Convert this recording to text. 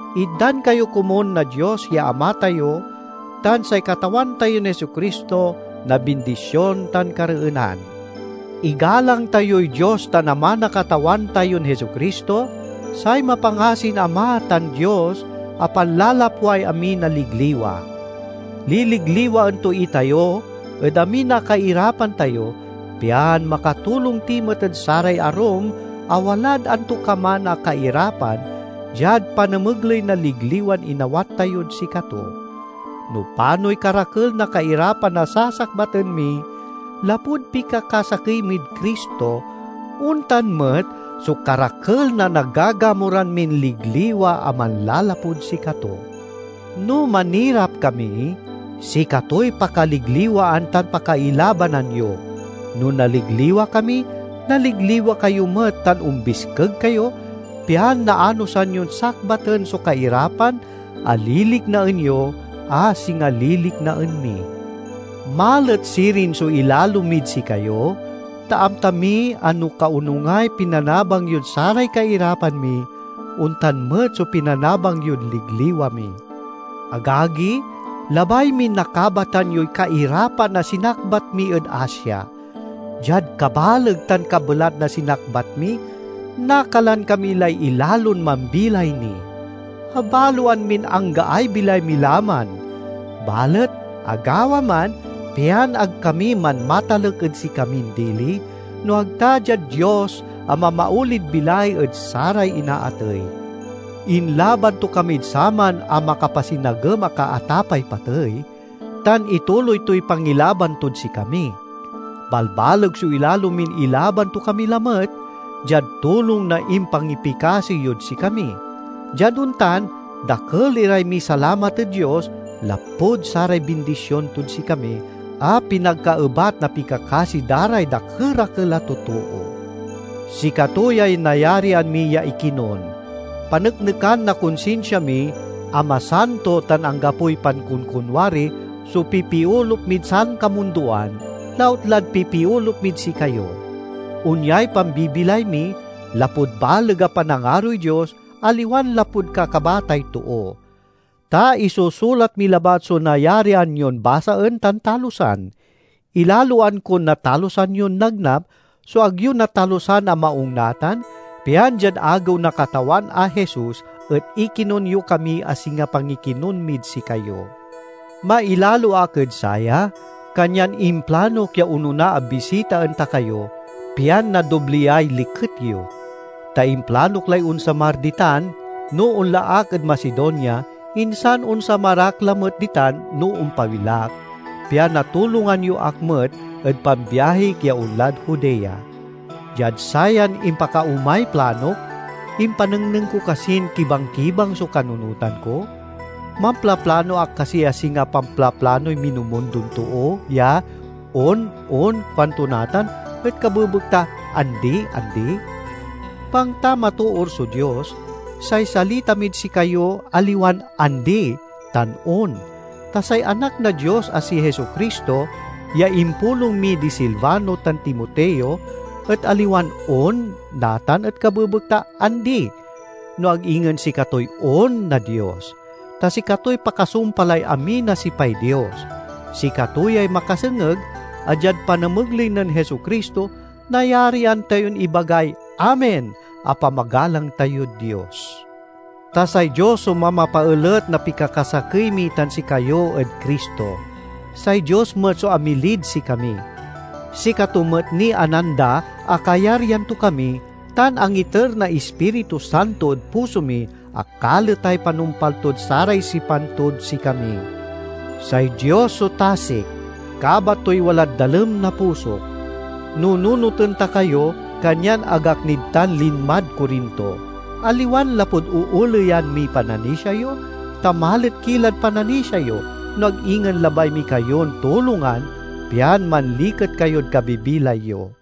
Itdan kayo komun na Dios ya Ama tayo tan say Katawan tayon Jesu-Cristo na bindision tan kareenan. Igalang tayoy Dios tan Ama na Katawan tayon Jesu-Cristo, say mapangasin Ama tan Dios a panlalapway amin a ligliwa! Liligliwaen to itayo ed amin a kairapan tayo, pian makatulong ti met ed saray arum a walad antokaman a kairapan diad panamegley na ligliwan inawat tayod sikato. No panoy karakel na kairapan a sasakbaten mi, lapud pikakasakey mid Cristo, ontan met so karakel na nagagamuran min ligliwa a manlalapud sikato. No manirap kami, sikatoy pakaligliwaan tan pakailabanan yo; no naligliwa kami, naligliwa kayo met tan ombiskeg kayo, pian naanosan yon sakbaten so kairapan a liliknaen yo, a singa liliknaen mi. Malet sirin so ilalo mid sikayo, ta amta mi a no kaonungay pinanabang yod saray kairapan mi, ontan met so pinanabang yod ligliwa mi. Agagi, labay min nakabatan yoy kairapan a sinakbat mi ed Asia. Diad kabaleg tan kabelat na sinakbat mi, nakalan kami lay ilalon mambilay ni. Abaloan min anggaay bilay mi la man. Balet agawa man, pian ag kami manmatalek ed sikamin dili, no ag ta diad Dios a mamaolid bilay ed saray inaatey. Inlaban to kamid saman a makapasinagem a kaatapay patey, tan ituloy toy pangilaban tod sikami. Balbaleg so ilalo min ilaban to kami lamet, diad tulong na impangipikasi yod sikami. Diad ontan dakel iray misalamat ed Dios lapud saray bindision tod sikami, a pinagkaebat na pikakasi da ray dakerakel a totoo. Sikato yay nayarian mi ya ikinon: paneknekan na konsinsia mi a masanto tan anggapoy pankonkonwari so pipiolup mid sankamundoan, lautlad pipiolup mid sikayo. Onyay pambibilay mi, lapud baleg a panangaroy Dios, aliwan lapud kakabatay too. Ta isusulat mi labat so nayarian yon basaen tan talusan. Ilaloan kon natalusan yon nagnap so ag yo natalusan a maung natan, pian diad Agew na Katawan a Jesus, et ikinon yo kami a singa pangikinon mid sikayo. Mailalo ak ed saya, kanyan implanok ya onona a bisitaen ta kayo, pian nadobliay liket yo. Ta implanok lay onsamar ditan no onla ak ed Macedonia, insan onsamar ak lamet ditan no ompawil ak, pian natulongan yo ak met ed pambiahik ya onlad Judea. Diad sayan impakaomay planok, impanengneng ko kasin kibangkibang so kanunotan ko? Mamplaplano ak kasi a singa pamplaplanoy minumundon too ya, "On, on," kuanto natan, et kabebekta "Andi, andi"? Bangta matoor so Dios, say salita mid sikayo aliwan "Andi" tan "On." Ta say Anak na Dios a si Jesu-Cristo ya impulong mi di Silvano tan Timoteo et aliwan "On" natan et kabebekta "Andi," no ag ingen sikatoy "On" na Dios, ta sikatoy pakasumpalay amin a sipay Dios. Sikato yay makasengeg, a diad panamegley nen Jesu-Cristo, nayarian tayon ibagay "Amen" a pamagalang tayod Dios. Ta say Dios so mamapaelet na pikakasakey mi tan sikayo ed Cristo. Say Dios met so amilid sikami. Sikato met niy ananda a kayaryan to kami, tan angiter na Ispiritu Santo ed puso mi, a kaletay panumpal tod saray sipan tod sikami. Say Dios so tasik—kabat toy walad dalem na pusok. Nununoten ta kayo, kanyan ag ak nid tan linmad Corinto. Aliwan lapud ooleyan miy pananisia yo, ta malet ki lad pananisia yo, no ag ingen labay mi kayon tulongan, pian manliket kayod kabibilay yo.